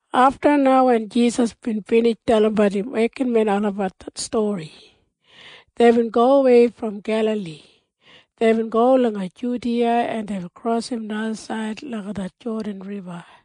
Afta na wen Jisas bin binij dalimbat im wekinmen olabat det stori, deibin gowei brom Gelali. Deibin go langa Judiya, en deibin krosim najasaid langa det Jodan Riba.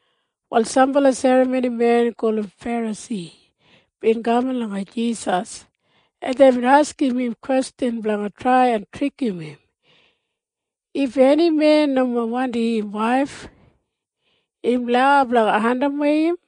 Wal sambala serramonimen gulum Ferasi bin kaman langa Jisas, en deibin askim im kwestjan blanga trai en trikim im, “If eni men nomo wandim im waif, im lau blanga andimwei im?”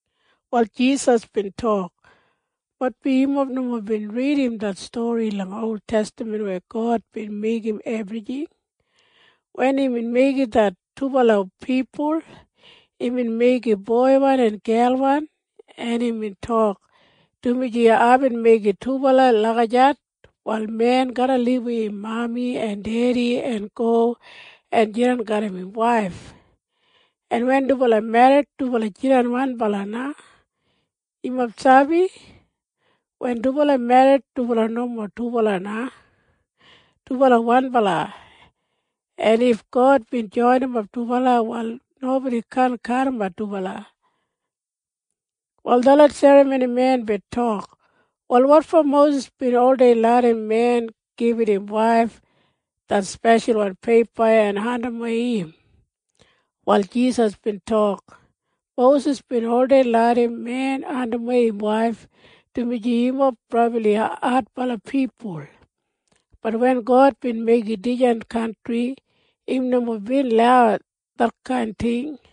Wal Jisas bin tok, “Maitbi yumob nomo bin ridim det stori langa oltestaman weya God bin meigim ebrijing. Wen imbin meigim det dubala pipul, imbin meigim boiwan en gelwan, en imbin tok, ‘Dumaji aibin meigim dubala lagijat, wal men garra libum im mami en dedi en go en jidan garram im waif, en wen dubala merrit, dubala jidan wanbala na.’ Yumob sabi? Wen dubala merrit, dubala nomo dubala na. Dubala wanbala. En if God bin joinimap dubala, wal nobodi kaan kadimat dubala.” Wal detlot serramonimen bin tok, “Wal wotfo Mosis bin oldei larram men gibit im waif det speshalwan peipa en andimwei im?” Wal Jisas bin tok, “Mosis bin oldei larram men andimwei im waif dumaji yumob brabli adbala pipul. Bat wen God bin meigim dijan kantri, im nomo bin lau detkain ting.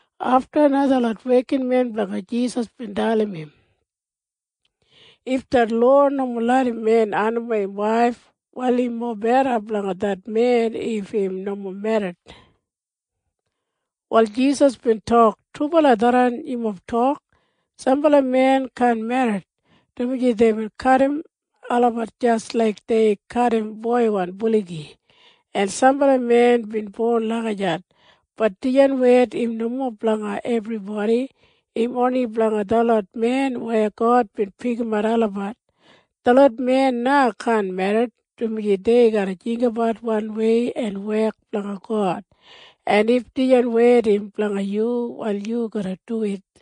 Afta na detlot wekinmen blanga Jisas bin dalim im, “If det lowa nomo larram men andimwei im waif, wal im mobeda blanga det men if im nomo merrit.” Wal Jisas bin tok, “Trubala tharran yumob tok. Sambala men kaan merrit, dumaji deibin kadim olabat jis laik dei kadim boiwan buligi. En sambala men bin bon lagijat. Bat dijan wed im nomo blanga ebribodi. Im oni blanga detlot men weya God bin pikimat olabat. Detlot men na kaan merrit, dumaji dei garra jinggabat wanwei en wek blanga God. En if dijan wed im blanga yu, wal yu garra duwit.”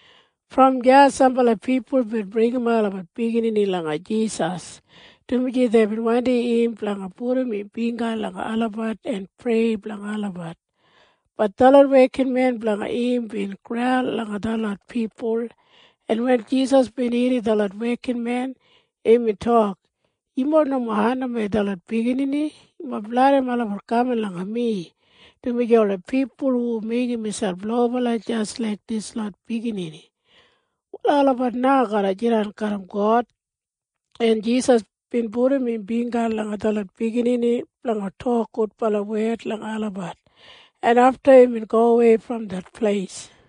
Brom deya sambala pipul bin bringimap olabat biginini langa Jisas, dumaji deibin wandim im blanga pudum im bingga langa olabat en prei blanga olabat. Bat detlot wekinmen blanga im bin graul langa detlot pipul, en wen Jisas bin irrim detlot wekinmen, imbin tok, “Yumob nomo andimwei detlot biginini. Yumob larram olabat kaman langa mi, dumaji ola pipul hu meigim miselp lobala jis laik dislot biginini, wal olabat na garra jidan garram God.” En Jisas bin pudum im bingga langa detlot biginini blanga tok gudbala wed langa olabat, en afta imbin gowei brom det pleis.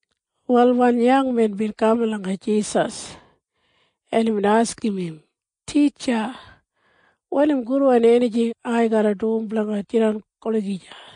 Wal wan yangmen bin kaman langa Jisas, en imbin askim im, “Titja, wanim gudwan enijing ai garra dum blanga jidan olagija?”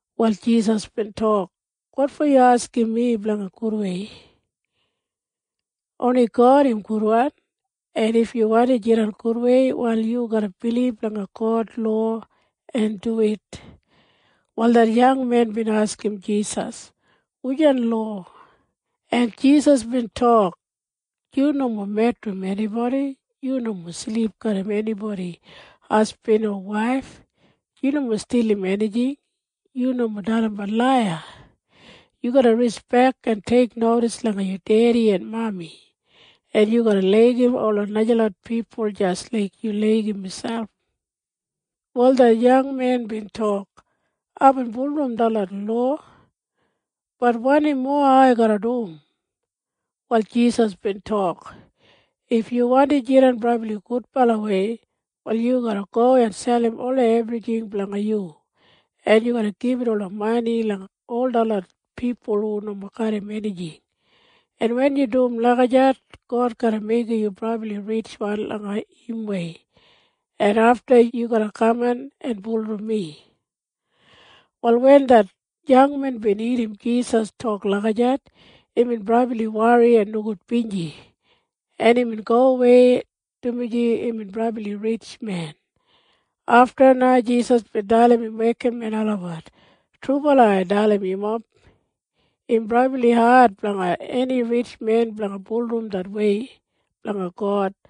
Wal Jisas bin tok, “Wotfo yu askim mi lagijat? Oni God im gudwan. En if yu wandi jidan gudwei, wal yu garra bilib langa God lowa en duwit.” Wal det yangmen bin askim Jisas, “Wujan lowa?” En Jisas bin tok, “Yu nomo medrim enibodi. Yu nomo silip garram enibodi hasbin o waif. Yu nomo stilim enijing. Yu nomo dalimbat laiya. Yu garra rispek en teiknodis langa yu dedi en mami. En yu garra laigim ola najalot pipul jis laik yu laigim miselp.” Wal det yangmen bin tok, “Aibin bulurrum detlot lowa. Bat wanim mowa ai garra dum?” Wal Jisas bin tok, “If yu wandi jidan brabli gudbalawei, wal yu garra go en selim ola ebrijing blanga yu, en yu garra gibit ola mani langa ol detlot pipul hu nomo garram enijing. En wen yu dum lagijat, God garra meigim yu brabli ritjwan langa imwei, en afta yu garra kaman en bulurrum mi.” Wal wen det yangmen bin irrim Jisas tok lagijat, imbin brabli wori en nogudbinji, en imbin gowei, dumaji imbin brabli ritjmen. Afta na Jisas bin dalim im wekinmen olabat, “Trubala ai dalim yumob. Im brabli ad blanga eni ritjmen blanga bulurrum det wei blanga God.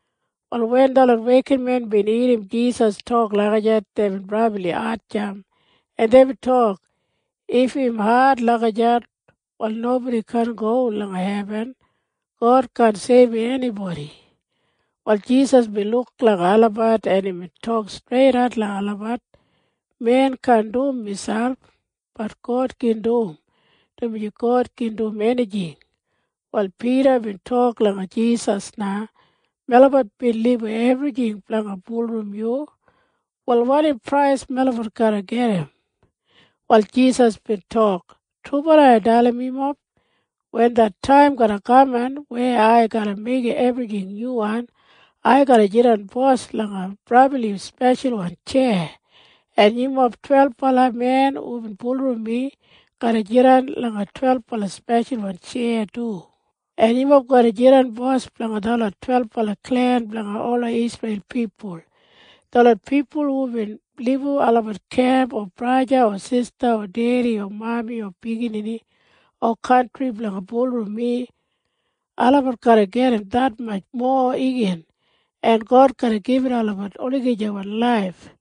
Wal wen detlot wekinmen bin irrim Jisas tok lagijat, deibin brabli hatjamp, en deibin tok, “If im ad lagijat, wal nobodi kaan go langa hebin! God kaan seibum enibodi!” Wal Jisas bin luk langa olabat, en imbin tok streidat langa olabat, “Men kaan dum miselp. Bat God gin dum, dumaji God gin dum enijing.” Wal Pida bin tok langa Jisas na, “Melabat bin libum ebrijing blanga bulurrum yu. Wal wanim prais melabat garra gedim?” Wal Jisas bin tok, “Trubala ai dalim yumob. Wen det taim garra kaman weya ai garra meigim ebrijing nyuwan, ai garra jidan bos langa brabli speshalwan tjeya, en yumob twelbala men hubin bulurrum mi garra jidan langa twelbala speshalwan tjeya du, en yumob garra jidan bos blanga detlot twelbala klen blanga ola Isreil pipul. Detlot pipul hubin libum olabat kemp o braja o sista o dedi o mami o biginini o kantri blanga bulurrum mi, olabat garra gedim detmatj mowa igin, en God garra gibit olabat det olagijawan laif.